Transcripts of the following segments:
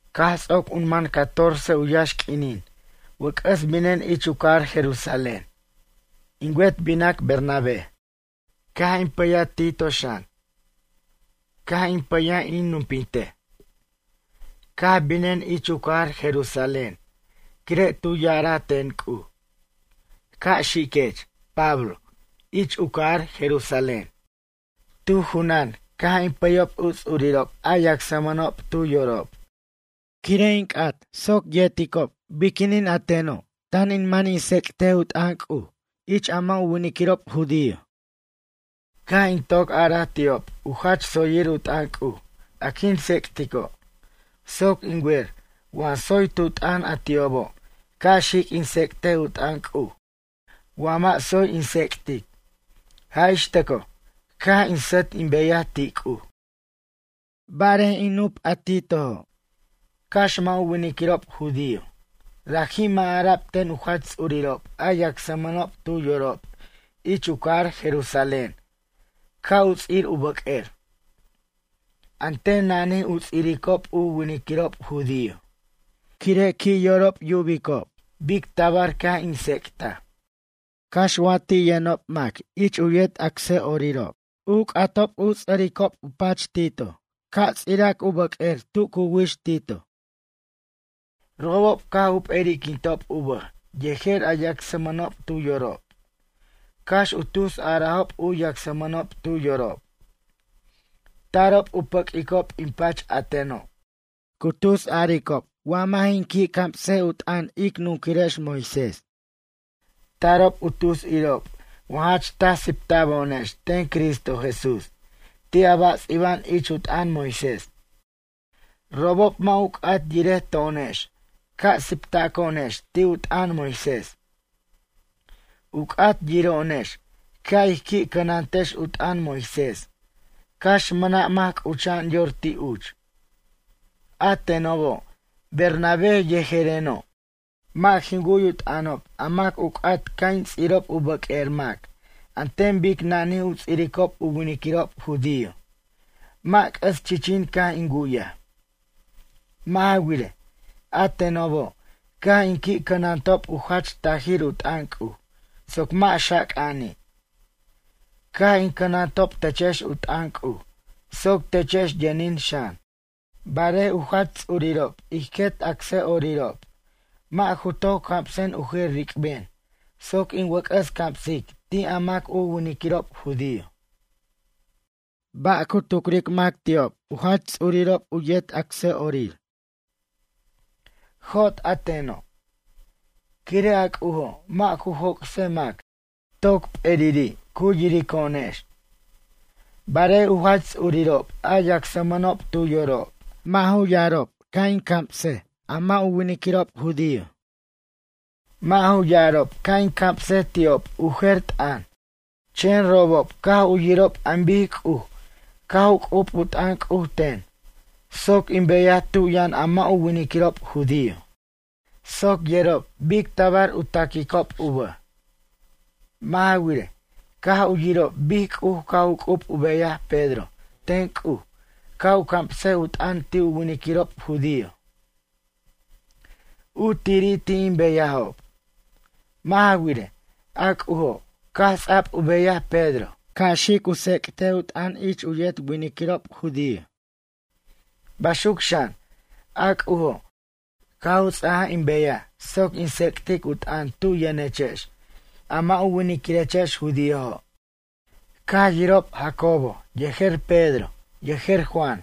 Caj ts'oc u man catorce u yaxq'uinin wʌc'ʌs binen ich u cajar Jerusalén. In wet binac Bernabé. Caj in pʌya Tito xan. Caj in pʌyaj in nupintej. Caj binen ich u cajar Jerusalén quire' tu ya'ara ten C'uj: “Ca' xiquech, Pablo, ich u cajar Jerusalén.” Tu junan caj in pʌyob u ts'urirob a yacsmʌnob tu yorob. Quire' in c'at soc yerta'rob biquinin a teno' tan in man in tsec't u t'ʌn C'uj ich a mʌ' u winiquirob judío. Caj in toc araj ti'ob u jach tsoyir u t'ʌn C'uj a quin tsec'tico', soc in wer wa tsoy tu t'ʌn a ti'obo' ca' xic in tsec'tej u t'ʌn C'uj wa mʌ' tsoy in tsec't. Jaj ix tʌco' caj in sʌt in beyaj ti' C'uj. Barej in nup a Titojo', cax mʌ' u winiquirob judío, raji' mʌ' ara'b ten u jach ts'urirob a yacsmʌnob tu yorob ich u cajar Jerusalén ca' u ts'ir u bʌq'uer. An ten nanij u ts'iricob u winiquirob judío, quire' qui' yorob yubicob bic tabar caj in tsec'taj. Cax wa ti' yʌnob mac ich u yet acsʌ'orirob caj u c'atob u ts'ʌric u pachob Tito ca' ts'irac u bʌq'uer tu cu wix Tito. Robob caj u p'eri'quintob u bʌj yejer a yacsmʌnob tu yorob cax u tus arajob u yacsmʌnob tu yorob. Tarob u pʌquicob in pach a teno', cu tus aricob wa mʌ' jin qui' cams u t'ʌn ic nunquirex Moisés. Tarob u tus irob wa jach taj sipta'bo'onex ten Cristo Jesús ti' a ba' ts'iba'an ich u t'ʌn Moisés. Robob mʌ' u c'at yirej to'onex ca' siptaco'onex ti' u t'ʌn Moisés. U c'at yiro'onex ca' ij qui'qui' cʌnantex u t'ʌn Moisés cax mʌna' mac c'ucha'an yor ti' uch. A tenobo', Bernabé yejereno', mʌ' jin wu'y u t'ʌnob a mac u c'at ca' in ts'irob u bʌq'uer mac an ten bic nanij u ts'iricob u winiquirob judío, mʌ' c'ʌs chichin caj in wu'yaj. Mʌ' ja wirej, a tenobo' caj in qui' canantob u jach tajir u t'ʌn C'uj soc mʌ' xaca'ani'. Caj in cʌnantob techex u t'ʌn C'uj soc techex yʌnin xan. Barej u jach ts'urirob ij quet acsʌ'orirob mʌ' ju toc camsen u jer ric'ben soc in wʌc'ʌs camsic ti' a mʌ' u winiquirob judío. Ba' cu tucric mac ti'ob u jach ts'urirob u yet acsa'orir. Jot a teno'. Quire' a C'ujo' mʌ' ju joc'sej mac, toc p'eriri' cu yirico'onex. Barej u jach ts'urirob a yacsmʌnob tu yorob mʌ' ju yarob ca' in cams a mʌ' u winiquirob judío. Mʌ' ju ya'arob ca' in camsej ti'ob u jer t'ʌn. Chen robob caj u yirob an bic C'uj caj u c'ub u t'ʌn C'uj ten soc in beyaj tu yʌn a mʌ' u winiquirob judío. Soc yerob bic tabar u taquicob u bʌj. Mʌ' ja wirej, caj u yirob bic C'uj caj c'ub u beyaj Pedro ten C'uj ca' u camsej u t'ʌn ti' u winiquirob judío. U tiri' ti' in beyajob. Mʌ' ja wirej, a C'ujo' caj ts'a'b u beyaj Pedro ca' xic u tsec't u t'ʌn ich u yet winiquirob judío. Baxuc xan, a C'ujo', caj u ts'aja in beyaj soc in tsec'tic u t'ʌn tu yʌnechex a mʌ' u winiquirechex judíojo'. Caj yirob Jacobo yejer Pedro yejer Juan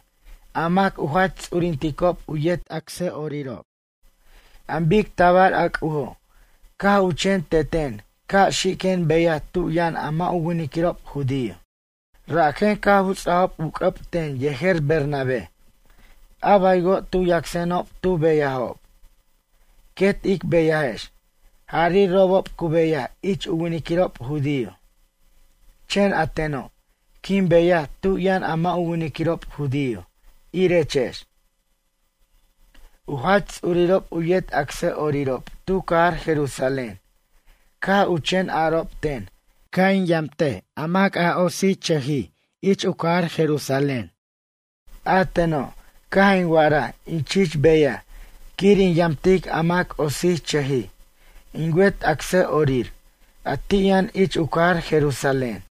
a mac u jach ts'urinticob u yet acsʌ'orirob an bic tabar a C'ujo' caj u chen teten ca' xiquen beyaj tu yʌn a mʌ' u winiquirob judío. Rajen caj u ts'ajob u c'ʌb ten yejer Bernabé, a baywo' tu yacsenob tu beyajob. Quet ic beyajex, jari' robob cu beyaj ich u winiquirob judío. Chen a teno', quin beyaj tu yʌn a mʌ' u winiquirob judío, irechex. U jach ts'urirob u yet acsʌ'orirob tu cajar Jerusalén caj u chen arob ten ca' in yamt a mac otsirchʌjij ich u cajar Jerusalén. A teno' caj in wa'araj in chich beyaj quir in yamtic a mac otsichʌjij in wet acsʌ'orir a ti' yʌn ich u cajar Jerusalén.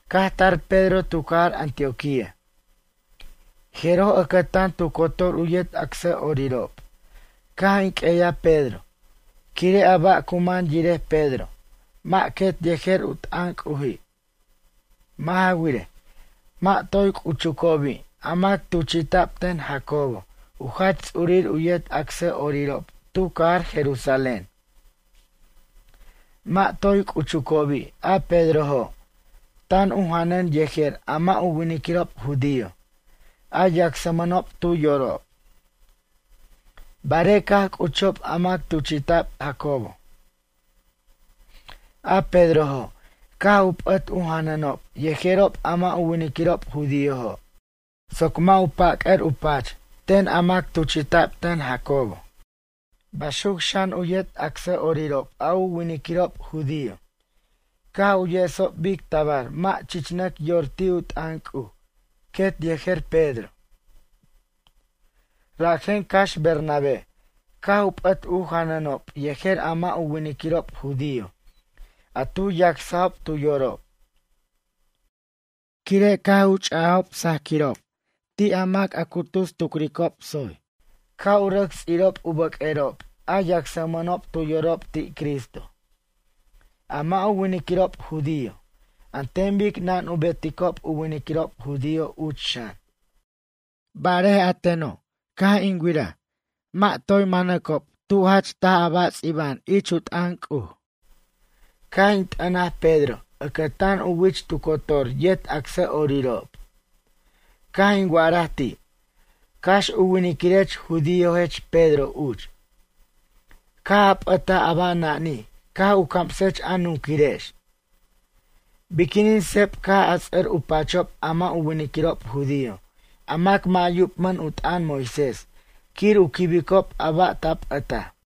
Caj tar Pedro tu cajar Antioquía. Jeroj ʌcʌtan tu cotor u yet acsʌ'orirob caj in q'ueyaj Pedro quire' a ba' cu man yirej Pedro mʌ' quet yejer u t'ʌn C'uji'. Mʌ' ja wirej, mʌ' toy c'uchucobi' a mac tuchi'ta'b ten Jacobo u jach ts'urir u yet acsʌ'orirob tu cajar Jerusalén. Mʌ' toy c'uchucobi' a Pedrojo', tan u janʌn yejer a mʌ' u winiquirob judío, a yacsmʌnob tu yorob. Barej caj c'uchob a mac tuchi'ta'b Jacobo, a Pedrojo' caj u p'ʌt u janʌnob yejerob a mʌ' u winiquirob judíojo' soc mʌ' u pʌc'ʌr u pach ten a mac tuchi'ta'b ten Jacobo. Baxuc xan u yet acsʌ'orirob a u winiquirob judío caj u yesob bic tabar mʌ' chichnʌc yor ti' u t'ʌn C'uj quet yejer Pedro. Rajen cax Bernabé caj u p'ʌt u janʌnob yejer a mʌ' u winiquirob judío a tu yacsajob tu yorob. Quire' caj u ch'ajob sajquirob ti' a mac a cu tus tucricob tsoy ca' u rʌc ts'irob u bʌq'uerob a yacsmʌnob tu yorob ti' Cristo, a mʌ' u winiquirob judío, an ten bic nan u beticob u winiquirob judío uch xan. Barej a teno' caj in wiraj mʌ' toy ju manob tu jach taj a ba' ts'iba'an ich u t'ʌn C'uj. Caj in t'ʌnaj Pedro ʌcʌtan u wich tu cotor yet acsʌ'orirob. Caj in wa'araj ti': “Cax u winiquirech judíojech Pedro uch, caj a p'ʌtaj a ba' nanij caj u camsech a nunquirex. Biquinin sep caj a ts'ʌr u pachob a mʌ' u winiquirob judío, a mac mʌ' yubmʌn u t'ʌn Moisés quir u quibicob a ba' ta p'ʌtaj?”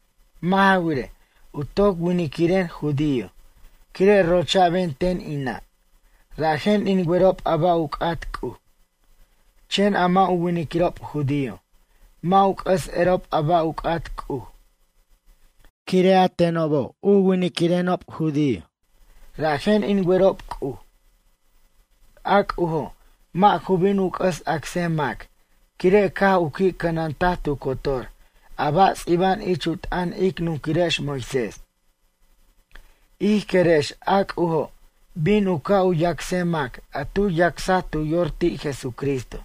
Mʌ' ja wirej, u toc winiquiren judío, quire' rocha'ben ten in nʌ'. Rajen in werob a ba' u c'at C'uj. Chen a mʌ' u winiquirob judío mʌ' u c'ʌs erob a ba' u c'at C'uj. Quire' tenobo' u winiquenob judío, rajen in werob C'uj. A C'ujo' mʌ' ju bin u c'ʌs acsej mac quire' caj u qui' cʌnantej tu cotor a ba' ts'iba'an ich u t'ʌn ic nunquirex Moisés. Ij querex a C'ujo' bin u ca' u yacsej mac a tu yacsaj tu yor ti' Jesucristo.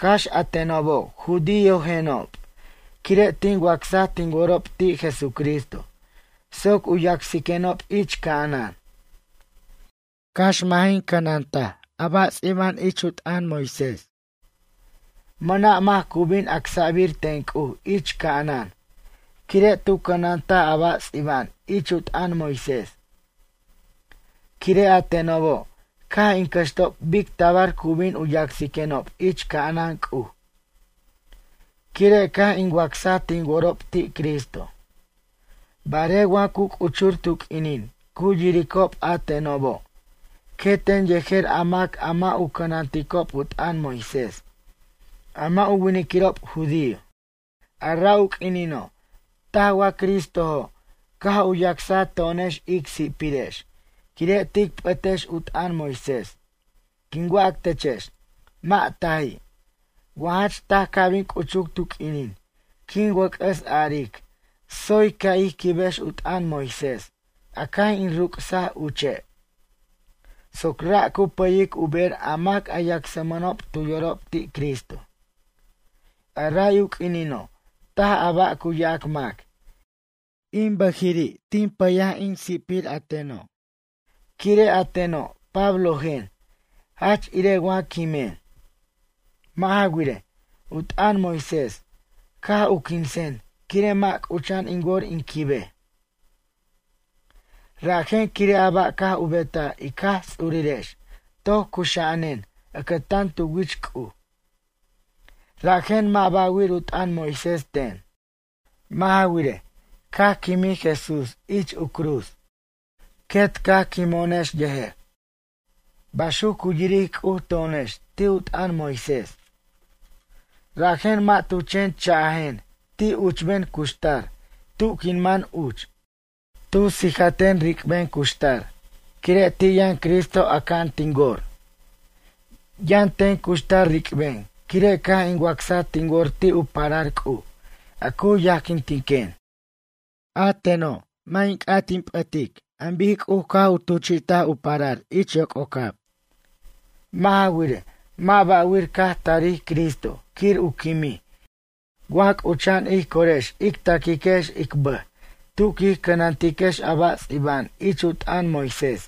Cax a tenobo' judíojenob quire' tin wacsa tin worob ti' Jesucristo soc u yacsiquenob ich ca'anan. Cax mʌ' jin cʌnantej a ba' ts'iba'an ich u t'ʌn Moisés. Mʌna' mac cu bin acsa'bir ten C'uj ich ca'anan quire' tu cʌnantaj a ba' ts'iba'an ich u t'ʌn Moisés. Quire' a tenobo' caj in cʌxtob bic tabar cu bin u yacsiquenob ich ca'anan C'uj quire' caj in wacsaj tin worob ti' Cristo. Barej wa cu c'uchur tu q'uinin cu yiricob a tenobo' queten yejer a mac a mʌ' u cʌnanticob u t'ʌn Moisés, a mʌ' u winiquirob judío. A ra' u q'uinino' taj wa Cristojo' caj u yacsa to'onex ic si'pirex quire' tic p'ʌtex u t'ʌn Moisés. Quin wac techex, mʌ' taji'. Wa jach taj ca' bin c'uchuc tu q'uinin quin wʌc'ʌs aric tsoy ca' ij quibex u t'ʌn Moisés a caj in rucsaj uche' soc ra' cu pʌyic u ber a mac a yacsmʌnob tu yorob ti' Cristo. A ray u q'uinino' taj a ba' cu yac mac. In bʌjiri' tin pʌy in si'pir a teno'. Quire' a teno' Pablojen jach ire wa quimen. Mʌ' ja wirej, u t'ʌn Moisés caj u quinsen quire' mʌ' c'ucha'an in wor in quibej. Rajen quire' a ba' caj u betaj ic Jaj Ts'urirex toc cuxa'anen ʌcʌtan tu wich C'uj. Rajen mʌ' ba'wir u t'ʌn Moisés ten. Mʌ' ja wirej, caj quimij Jesús ich u cruz, quet caj quimo'onex yejer. Baxuc cu yiric C'uj to'onex ti' u t'ʌn Moisés. Rajen mʌ' tu chen cha'jen ti' a uchben cuxtar tu quin man uch. Tu sijaten ric'ben cuxtar quire' ti' yʌn Cristo aca'an tin wor. Yʌn ten cuxtar ric'ben quire' caj in wacsaj tin wor ti' u parar C'uj a cu yajquintiquen. A teno' mʌ' in c'at in p'ʌtic an bic C'uj caj u tuchi't u parar ich yoc'ocab. Mʌ' ja wirej, mʌ' ba'wir caj tarij Cristo quir u quimij wa c'ucha'an ij corex ic taquiquex ic bʌj tu quij cʌnantiquex a ba' ts'iba'an ich u t'ʌn Moisés.